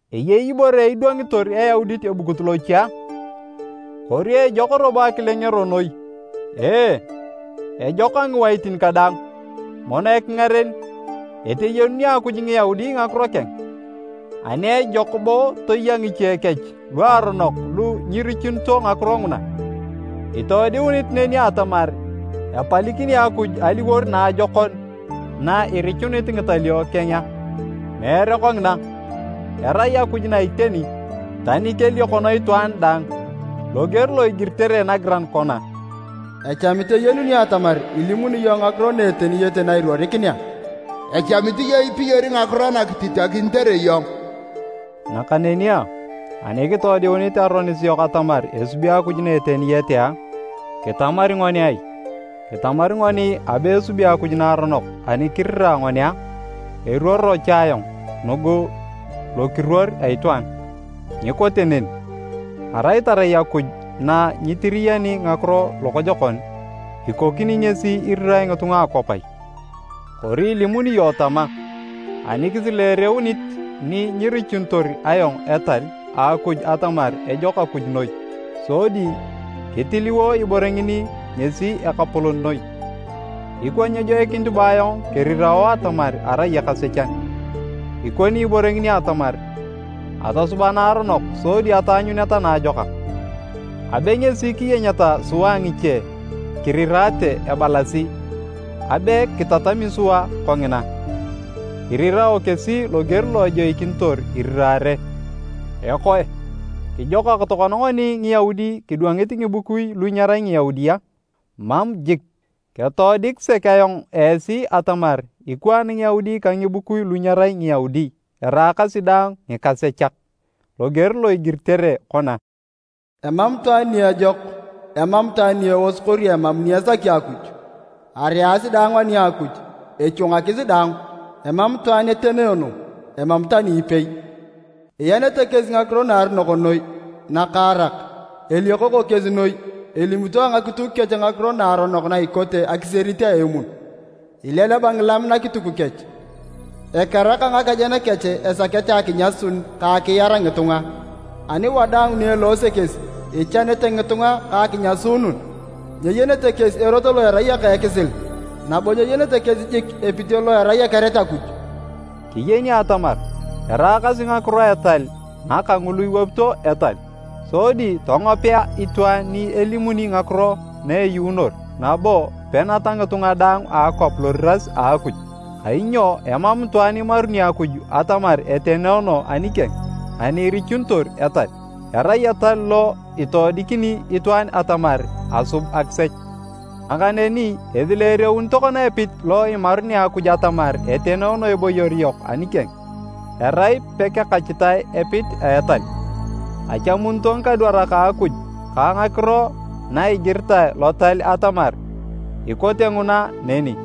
Eyei ibore idwangitor Eyaudit ebukut loche a? Kori ejok robo akilengero noi? Ee, ejok a ngiwaitin kadaang! Mono ekingaren, eteyenuni Akuj Ngiyaudi ngakiro keng. Ani ejok bo toya ngiche kech luaronok lu nyirichunito ngakiro nguna? Itoodiunit neni atamar epalikini Akuj aliwor naajokon na irichunit ngitalio keng a? Meere kongina! Erai Akuj na iteni, tani keliokono itwaan daang. Loger lo igiritere nagiran kona, “Echamit eyenunio atamar ilimuni iyong ngakiro na eteniyete na iruorikinea. Echamit iyong ipiyori ngakiro nakititakinitere iyong.” Nakaneni a, ani kitoodiunit aronis yok atamar esubi Akuj na eteniyete a, kitamari ngoni ai? Kitamari ngoni abe esubi Akuj naaronok ani kirira ngoni a? (Eruoro cha ayong nugu lokiruor a itwaan.) Nyikote neni! Arai tarai Akuj na nyitiriyani ngakiro lokojokon, ikokini ngesi irirae ngitunga a akwap ai? Kori ilimuni iyong tama, “Ani kisileereunit ni nyerichunitor ayong etal a Akuj atamar ejok Akuj noi, sodi kitiliwo ibore ngini ngesi akapolon noi, ikwa nyejoikinit bo ayong kerirao atamar arai ekasechan”. Ikoni ibore ngini atamar, “Atosuba naaronok sodi ataanyuneta naajokak!” Abe ngesi kiyenyeta sua ngiche kirirate ebalasi abe kitatami sua kongina. Irirao kesi loger lo ejoikinitor iriraare. Ekoe, kijokak tokona ngoni Ngiyaudi kidwangit ngibukui lu nyerai Ngiyaudi a? Mam jik! Ketoodik sek ayong esi atamar ikwaan Ngiyaudi ka ngibukui lu nyerai Ngiyaudi eraakasi daang ngikasechak. Loger lo igiritere kona, “Emam itwaan ni ejok, emam itwaan ni eos kori emam ni esaki Akuj. Areasi daang ani a Akuj echwangakis daang, emam itwaan etenoono, emam tani ipei. Ianete kesi ngakiro naaronok noi nakaarak, eliokoko kesi noi, elimito ngakituk kech ngakiro naaronok na ikote akisierit a emun, ileleba ngilam nakituk kech. Ekeraka ngakejen kech, esakete akinyasun ka akiar ngitunga, ani wadaang ni eloose kesi, ichanete ngitunga ka akinyasuunun. Nyeyenete kesi erot lo erai eka a ekisil, nabo nyeyenete kesi jik epit lo erai ekeret Akuj.” Kiyeni atamar eraakasi ngakiro a etal ngaka ngulu iwapito etal, sodi tongopea itwaan ni elimuni ngakiro na eyuunor nabo peneta ngitunga daang a akwap loriras a Akuj. Kainyo emam itwaan imaruni Akuj atamar etenoono anikeng ani irichunitor etal. Erai etal lo itoodikini itwaan atamar asub akisech. Nakaneni esileereun tokona epit lo imarunea Akuj atamar etenoono eboyor yok anikeng, erai pekekachitae epit a etal. Achamunito ngikadwarak a Akuj ka ngakiro na egiritae Lotal atamar ikote nguna neni.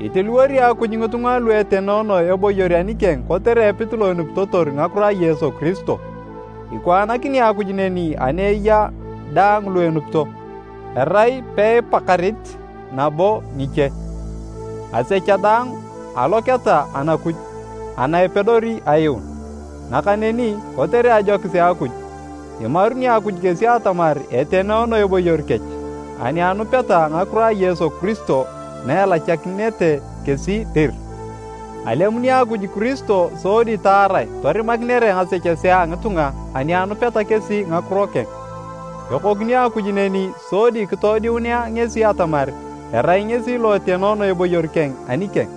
Itiliwori Akuj ngitunga lu etenoono eboyor anikeng kotere epit lo enupitotor ngakiro a Yesu Kiristo. Ikwaanakini Akuj neni ani eya daang lu enupito, erai peipakarit nabo ngiche, asecha daang aloketa Anakuj ana epedori ayuun. Nakaneni kotere ajokis a Akuj, imaruni Akuj kesi atamar etenoono eboyor kech ani anupeta ngakiro a Yesu Kiristo na elachakinete kesi dir. Alemuni Akuj Kiristo sodi taarae torimakinere ngasechesea a ngitunga ani anupeta kesi ngakiro keng. Ekokini Akuj neni sodi kitoodiunea ngesi atamar erai ngesi lo etenoono eboyor keng anikeng.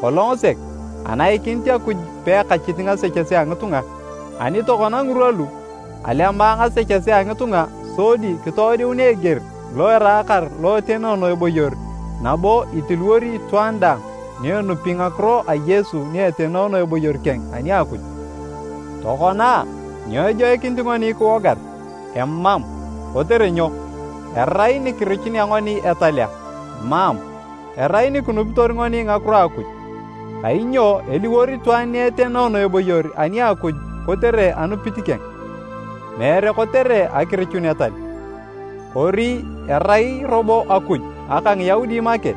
Kolong sek, anaikinit Akuj peakachit ngasechesea a ngitunga. Ani tokona ngirwa lu, alema ngasechesea a ngitunga sodi kitoodiunea eger lo eraakar lo etenoono eboyor nabo itiliwori itwaan daang ni enupi ngakiro a Yesu ni etenoono eboyor keng ani a Akuj. Tokona a, nyo ejoikinit ngoni kiwogar? Emam! Kotere nyo? Erai nikirichunea ngoni etal a? Mam! Erai nikinupitor ngoni ngakiro a Akuj. Kainyo eliwor itwaan ni etenoono eboyor ani a Akuj kotere anupit keng, meere kotere akirichun etal. Kori erai robo Akuj aka Ngiyaudi make?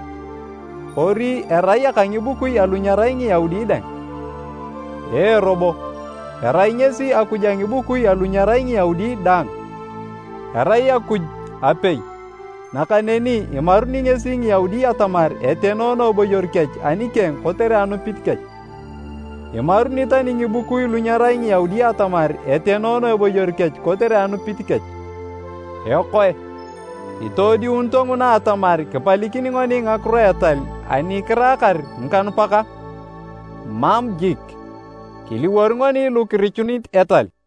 Kori erai aka ngibukui alu nyerai Ngiyaudi dang. Ee robo, erai ngesi Akuj a ngibukui alu nyerai Ngiyaudi dang. Erai Akuj apei, nakaneni imaruni ngesi Ngiyaudi atamar etenoono eboyor kech anikeng kotere anupit kech. Imaruni tani ngibukui lu nyerai Ngiyaudi atamar etenoono eboyor kech kotere anupit kech. Ekoe, itoodiunito nguna atamar kipalikini ngoni ngakiro a etal ani kiraakar ngikanupak a? Mam jik, kiliwor ngoni lu kirichunit etal.